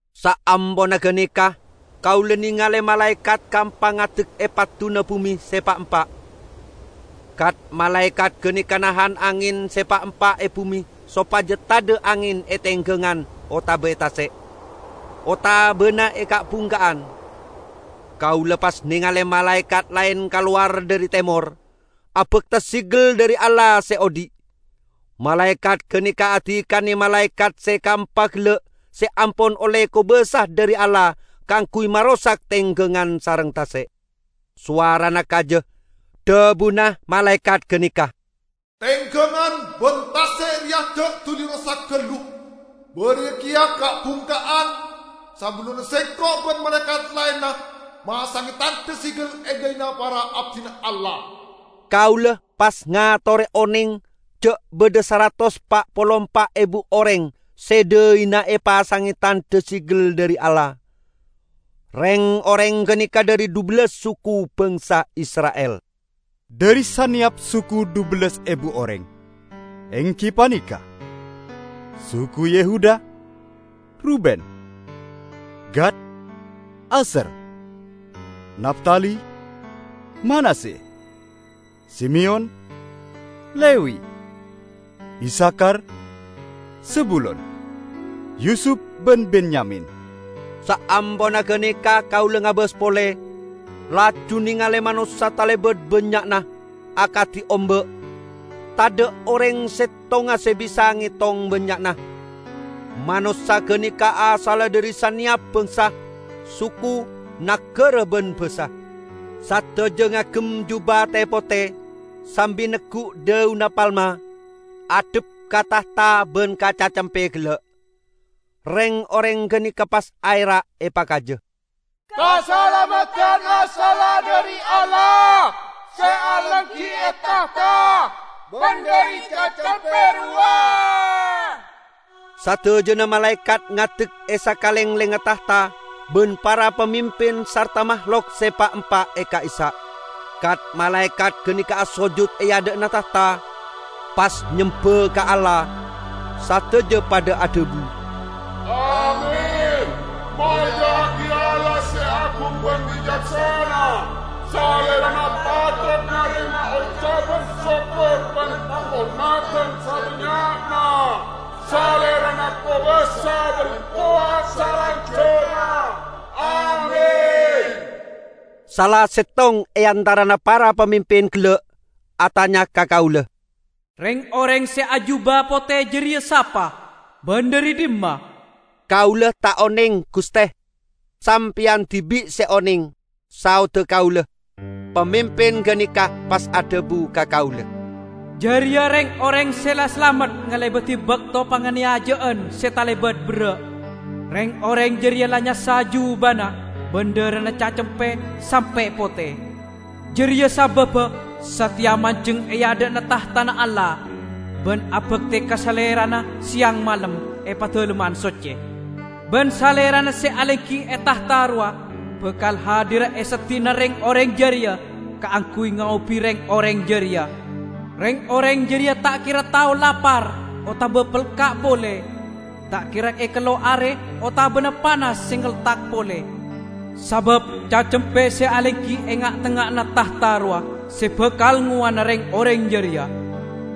Saamponna ganeka kaula nengale malaekat kaempa ngadek e padduna bume se pa'-empa'. Kat-malaekat ganeka nahan angen se pa'-empa' e bume sopaja tadha' angen e tenggangan otaba e tase', otabana e ka'-bungka'an. Kaula pas nengale malaekat laen kalowar dhari temor, abakta segel dhari Allah se odhi'. Malaekat ganeka adikane malaekat se kaempa gella' se ampon olle kobasa dhari Allah kaangguy marosak tenggangan sareng tase'; sowarana kaja. Dhabuna malaekat ganeka, "Tenggangan ban tase' reya ja' duli rosak gallu, bariya keya ka'-bungka'an, sabellunna sengko' ban malaekat laenna masange tandha segel e dhaina para abdina Allah." Kaula pas ngatore oneng ja' badha saratos pa' polo empa' ebu oreng se dhaina epasange tandha segel dhari Allah. Reng-oreng ganeka dhari dhubellas suku bangsa Isra'il; dhari saneyap suku dhubellas ebu oreng, enggi paneka: suku Yehuda, Ruben, Gad, Asyer, Naftali, Manasye, Simeyon, Lewi, Isakhar, Zebulon, Yusup ban Benyamin. Saamponna ganeka kaula ngabas pole, laju nengale manossa talebat bannya'na, akadi omba' -- tadha' oreng settonga se bisa ngetong bannya'na. Manossa ganeka asalla dhari saneyap bangsa, suku, nagara ban basa. Sadaja ngagem juba te-pote, sambi neggu' dhaunna palma, addhep ka tahta ban ka Cacempe gella'. Reng-oreng ganeka pas aera' epakaja, "Kasalameddan asalla dhari Allah, se alenggi e tahta, ban dhari Cacempe rowa!" Sadajana malaekat ngadek e sakalenglengnga tahta ban para pamimpin sarta mahlok se pa'-empa' ka'issa'. Kat-malaekat ganeka asojut e adha'na tahta, pas nyemba ka Allah. Sadaja padha adhabu, "Amin! Molja'agi Allah se agung ban bicaksana. Salerana patot narema ocaban sokkor ban panghormadan sabannya'na. Salerana kobasa ban kowat salanjangnga! Amin!" Sala settong e antarana para pamimpin gella' atanya ka kaula, "Reng-oreng se ajuba pote jareya sapa, ban dhari dhimma?" "Kaula ta' oneng, guste; sampeyan dibi' se oneng," saodda kaula. Pamimpin ganeka pas adhabu ka kaula, "Jareya reng-oreng se la salamet ngalebadi bakto panganeyaja'an se talebat berra'. Reng-oreng jareya la nyassa jubana ban dharana Cacempe sampe' pote. Jareya sababba sateya manjeng e adha'na tahtana Allah, ban abakte ka Salerana seyang malem e Padalemman Socce. Ban Salerana se alenggi e tahta rowa bakal hadira e seddi'na reng-oreng jareya kaangguy ngaobi reng-oreng jareya. Reng-oreng jareya ta' kera tao lapar otaba pelka' pole; ta' kera ekello' are otabana panas se ngeltak pole, sabab Cacempe se alenggi e nga'-tengnga'anna tahta rowa se bakal ngowana reng-oreng jareya.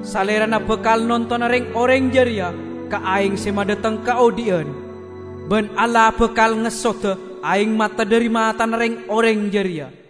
Salerana bakal nontona reng-oreng jareya ka aeng se madhateng kaodhi'an. Ban Allah bakal ngessoda aeng mata dhari matana reng-oreng jareya."